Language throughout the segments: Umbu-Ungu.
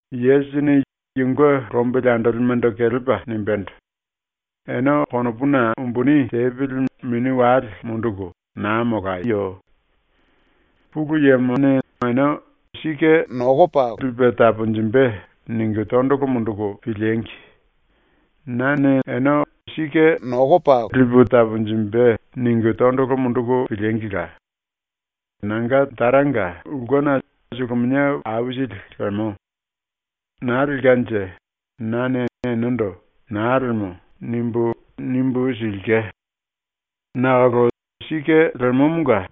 Yesusini yunge lombili andolimendo kelepa nimbendo: “Ene konopuna umbuni tepili mini wale munduku naa molayo. Pulu Yemo ene ‘Lipe taponjimbe.’ ningu tondolo munduku piliengi! Nane ene ‘Lipe taponjimbe.’ ningu tondolo munduku piliengila! Nanga Taranga ulkena suluminia aisili lemo. Naa lelkanje nane enendo “Naa lemo.” nimbu, nimbu silke. Nakolo sike lemomonga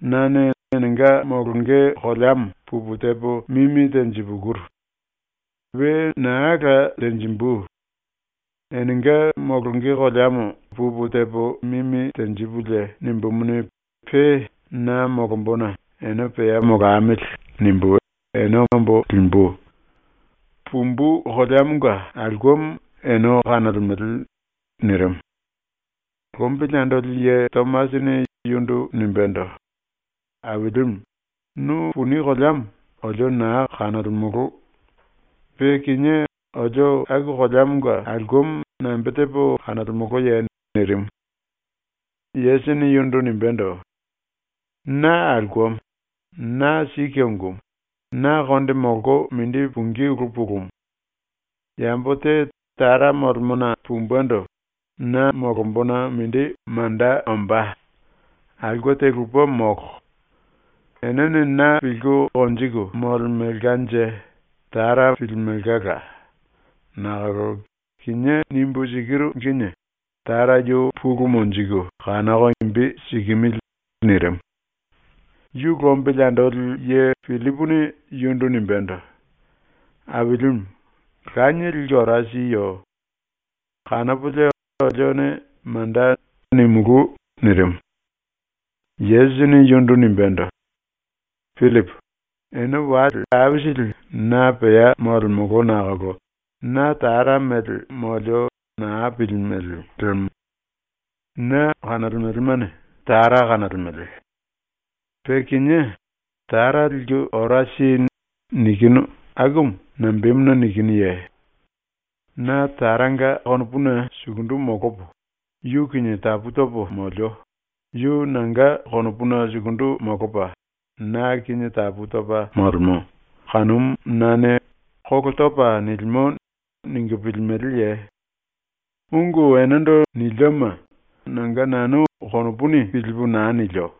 nane enenga molonge koleamo pupu tepo mimi tenjipukuru. We naa la tenjimbu. Enenga molonge koleamo pupu tepo mimi tenjipulie nimbumuni, pe na molombona ‘Ene pea molamili.’ nimbu ene ombo limbu. Pumbu koleamonga aulkemo ene kanolemele.” nirimu. Lombili andoli ye Tomasini yundu nimbendo: “Ailimu, nu puni koleamo olio naa kanolemolo. Pe kinié olio aku koleamonga aulkemo nambe tepo kanolemoloye?” nirimu. Yesusini yundu nimbendo: “Na aulkemo, na sike ungumu, na konde molko mindi pungí ulu pulumu. Yambo te Tara molemona pumbendo na molombona mindi manda ombá. Aulke te lupe molo. Enene na pilku konjiku molemelkanje Tara pilimelkala. Nakolo kinié nimbu sikiru kinie Tara yu pulu monjiku kanoko imbi sikimili.” nirimu. Yu lombili andoli ye Pillipuni yundu nimbendo: “Ailimu, Lanie liku ora siyo. Kanopolie olione “Manda.” nimulú.” nirimu. Yesusini yundu nimbendo: “Pillipu, ene wale aisili na pea molemolo nakolo na Tara mele molio naa pilimele lemo. Na kanolemelemane Tara kanolemele. Pe kinié “Tara liku ora si.” nikinu akumu nambemuna nikinuye? Na Taranga konopuna sukundu molopo yu kinie tapu topo molio, yu nanga konopuna sukundu molopa na kinie tapu topa molemo, kanumu nane ‘Kolo topa nilimo.’ ningu pilimeleye? Ungu enendo nilioma nanga nanu konopuni pilipu naa nilio.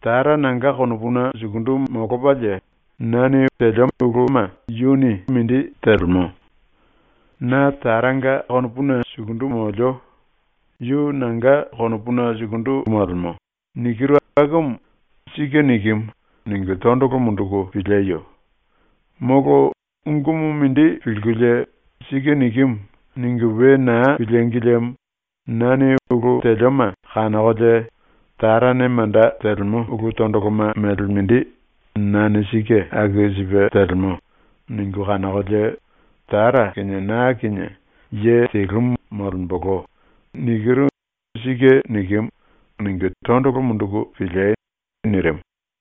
Tara nanga konopuna sukundu molopalie na ulu telioma yuni yunge mindi telemo. “Na Tara kinie konopuna sukundu molio, yu na kinie konopuna sukundu molemo.” nikiru akumu ‘Sike nikimu.’ ningu tondolo munduku pilieyo. Molo ungumu mindi pilkulie ‘Sike nikimu.’ ningu we naa pilíngi liemo nane ulu telioma kanokolie ‘Tarane manda telemo ulu tondoloma mele mindi nane sike aku sipe telemo.’ ningu kanokolie “Tara kinie na kinie ye telumu molembolo.” nikiru ‘Sike nikimu.’ ningu tondolo munduku piliei.” nirimu.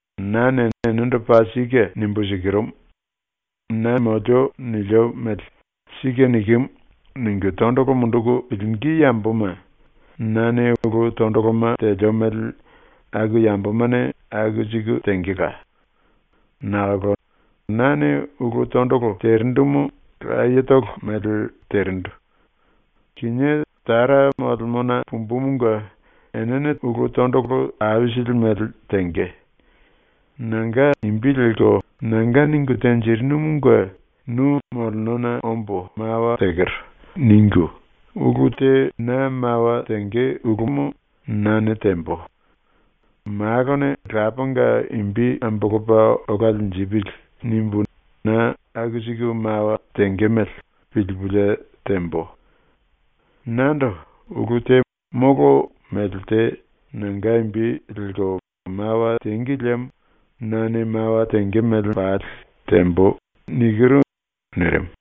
“Nane enendo paa sike nimbu sikirumu: Nane molio nilio mele ‘Sike nikimu.’ ningu tondolo munduku pilingí yamboma nane ulu tondoloma telio mele aku yambomane aku siku tengela. Nakolo nane ulu tondolo terindumu layetolo mele terindu. Kinié Tara molemona pumbumunge enene tondolo aisili mele tenge. Nanga imbi lelko ⸤‘Nanga ningu tenjirinumunge nu molenona ombo mawa tekero.’ ningu⸥ ulu te na mawa tenge ulumu nane tembo. ‘Malone Lapanga imbi ambolopa ola linjipili.’ nimbu na aku siku mawa tenge mele pilupulie tembo. Nando ulu te molo mele te nanga imbi lelko mawa tengi liemo nane mawa tenge mele pali tembo.” nirimu.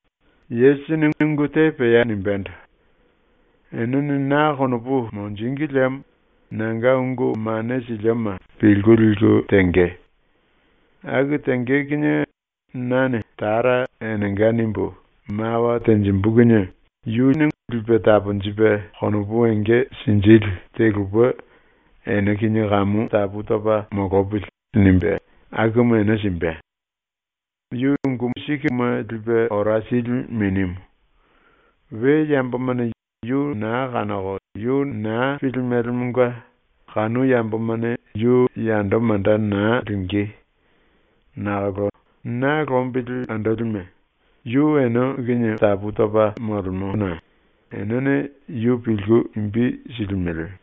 Yesusini ungu te pea nimbendo: “Enene na konopu monjíngi liemo nanga ungu mane silioma pilku liku tenge. Aku tenge kinie nane Tara enenga nimbu mawa tenjimbu kinie yu Lipe Taponjipe Konopu Enge Sinjili te lupe ‘Ene kinie kamu molopili.’ nimbe akumu ene simbe. Yu Sike Unguma Lipe Ora Sili Minimu. We yambomane yu naa kanoko yu naa pilimelemonga kanu yambomane yu yando manda naa lingí. Nakolo na lombili andolime, yu ene kinie molemo, pe enenga konopuna molombana enene yu pilku imbi silimele.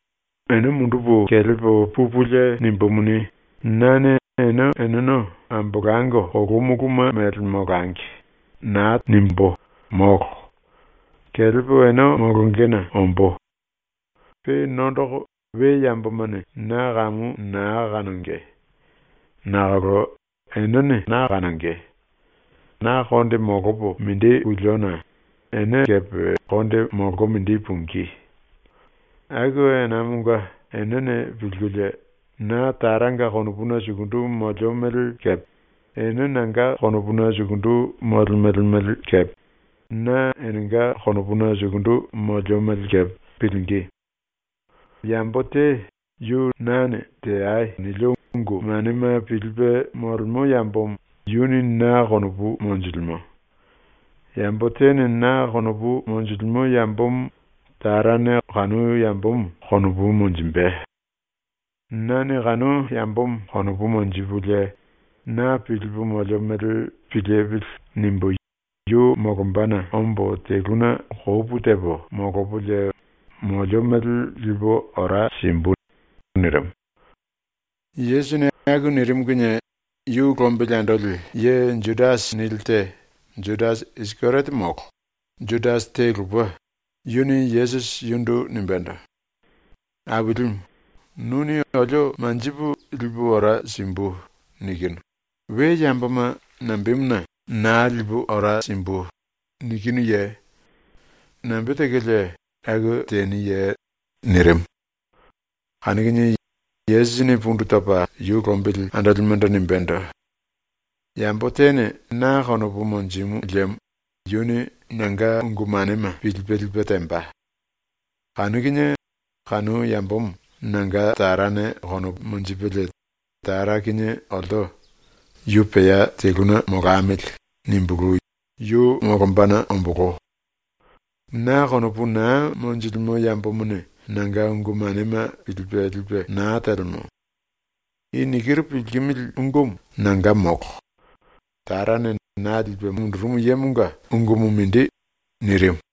“Ene mundupu kelepo pupulie nimbumuni, nane ‘Ene eneno ambolango kolu muluma mele molangi.’ nimbu naa tembo, molo. Kelepo ene molongena ombó. Pe nondoko we yambomane na kamu naa kanonge. Nakolo enene na kanonge. Na konde molopo mindi puliona ene kepe konde molko mindi pungí. Aku enamonga enene pilkulie, ‘Na Taranga konopuna sukundu molio mele kepe, ene nanga konopuna sukundu molemele mele kepe, na enenga konopuna sukundu molio mele kepe’ pilingí. Yambo te yu nane “Teai.” nilio ungu manema pilipe molemo yambomo yuni na konopu monjilimo. Yambo tene na konopu monjilimo yambomo Tarane kanu yambomo konopu monjimbe. Nane kanu yambomo konopu monjipulie ‘Na pilipu molio mele pilipili.’ nimbu yu molombana ombo teluna kopu tepo molopolie molio mele lipu ora simbu.” nirimu. Yesusini aku nirimu kinie yu lombili andoli ye ‘Judasi’ nili te, Judasi Isikeriote molo, Judasi te lupe, yuni Yesusi yundu nimbendo: “Ailimu, nuni olio manjipu “lipu ora simbu.” nikinu, we yamboma nambemuna “Naa lipu ora simbu.” nikinuye? Nambe tekolie aku teniye?” nirimu. Kanu kinie Yesusini pundu topa yu lombili andolimendo nimbendo: “Yambo tene na konopu monjimu liemo yuni nanga ungu manema pilipe lipe temba. Kanu kinie kanu yambomo nanga Tarane konopu monjipelie Tara kinie olto ‘Yu pea teluna molamili.’ nimbulu yu molombana ombolo. Na konopu naa monjilimo yambomone nanga ungu manema pilipe lipe naa telemo. I nikiru pilkimili ungumu nanga molo. Tarane na lipe mundurumu yemonga ungumu mindi.” ⸤nirimu.⸥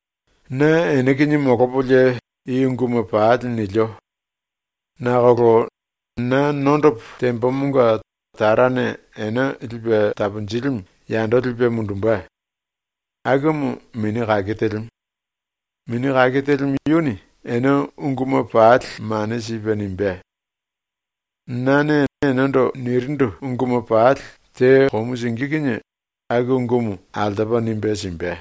“Na ene kinie molopolie i unguma pali nilio. Nakolo na nondopo tembomonga Tarane Ene Lipe Taponjilimu yando lipe mundumbe. Akumu Mini Kake Telimu. Mini Kake Telimu yuni ene unguma pali mane sipe nimbé; nane enendo nirindu unguma pali te komu singí kinie aku ungumu altopa nimbe simbe.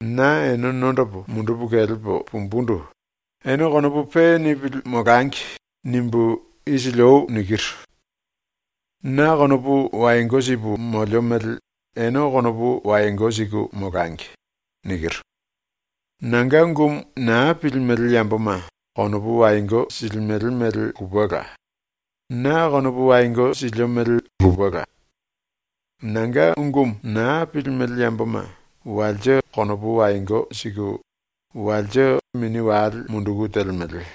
“Na ⸤ene nondopo mundupu kelepo pumbundu⸥ “Ene konopu pe nipili molangi.” nimbu isili ou nikiru. “Na konopu wayongo sipu molio mele ene konopu wayongo siku molangi.” nikiru. Nanga ungumu naa pilimele yamboma konopu wayongo silimele mele lupela; na konopu wayongo silio mele lupela. Nanga ungumu naa pilimele yamboma walse konopu wayongo siku walse mini wale munduku telemele.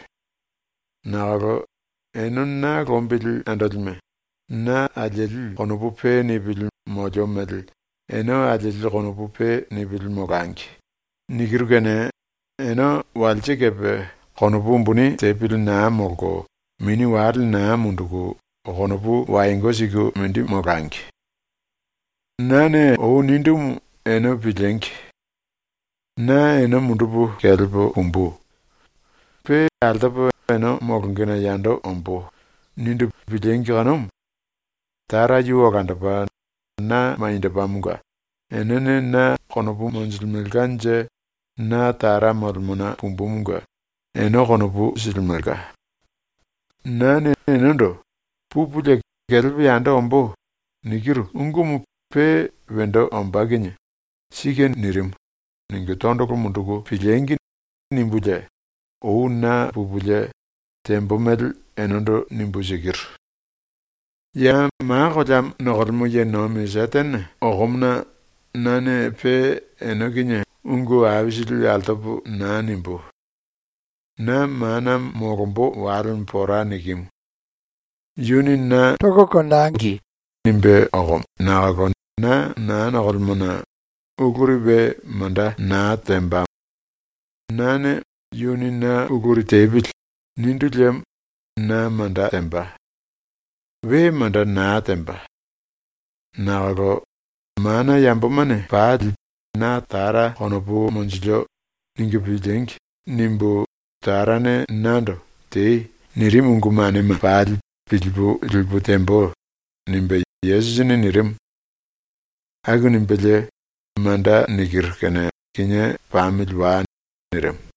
Nakolo ene na lombili andolime, “Na alieli konopu pe nipili molio mele ene alieli konopu pe nipili molangi.” nikiru kene ene walse kepe konopu umbuni tepili naa molko mini wale naa munduku konopu wayongo siku mindi molangi. “Nane ou nindumu ene piliengi. “Na ene mundupu kelepo pumbu. Pe altopo ene molongena yando ombó.” nindu piliengi kanumu. Tara yu olandopa na maniendopamonga enene na konopu monjilimelkanje na Tara molemona pumbumunge ene konopu silimelka. Nane enendo “Pupulie kelepo yando ombó.” nikiru ungumu pe wendo ombá kinie ‘ ‘Sike nirimu.’ ningu tondolo munduku piliengi!’ nimbulie ou naa pupulie tembo mele enendo nimbu sikiru. “Ya ma koleamo nokolemo ye nomi ⸤Setene⸥ okomona nane pe ene kinie ungu aisili altopo naa nimbú. ⸤Na mana molombo walemo pora nikimu. Yuni na ‘Tangi.’ nimbe okomo⸥ nakolo na naa nokolemona uluri we manda naa tembamo. ⸤Nane ‘Yuni na uluri tepili.’ nindu liemo na manda temba. We manda naa temba.⸥ Nakolo ‘ ‘Mana yambomane pali na Tara konopu monjilio.’ ningu piliengi!’ nimbu Tarane nando “Tei.” nirimu ungu manema pali pilipu lipu tembo.” ⸤nimbe Yesusini nirimu.⸥ ⸤Aku nimbelie⸥ “Manda nikiru kene kinié pamili wai.” nirimu.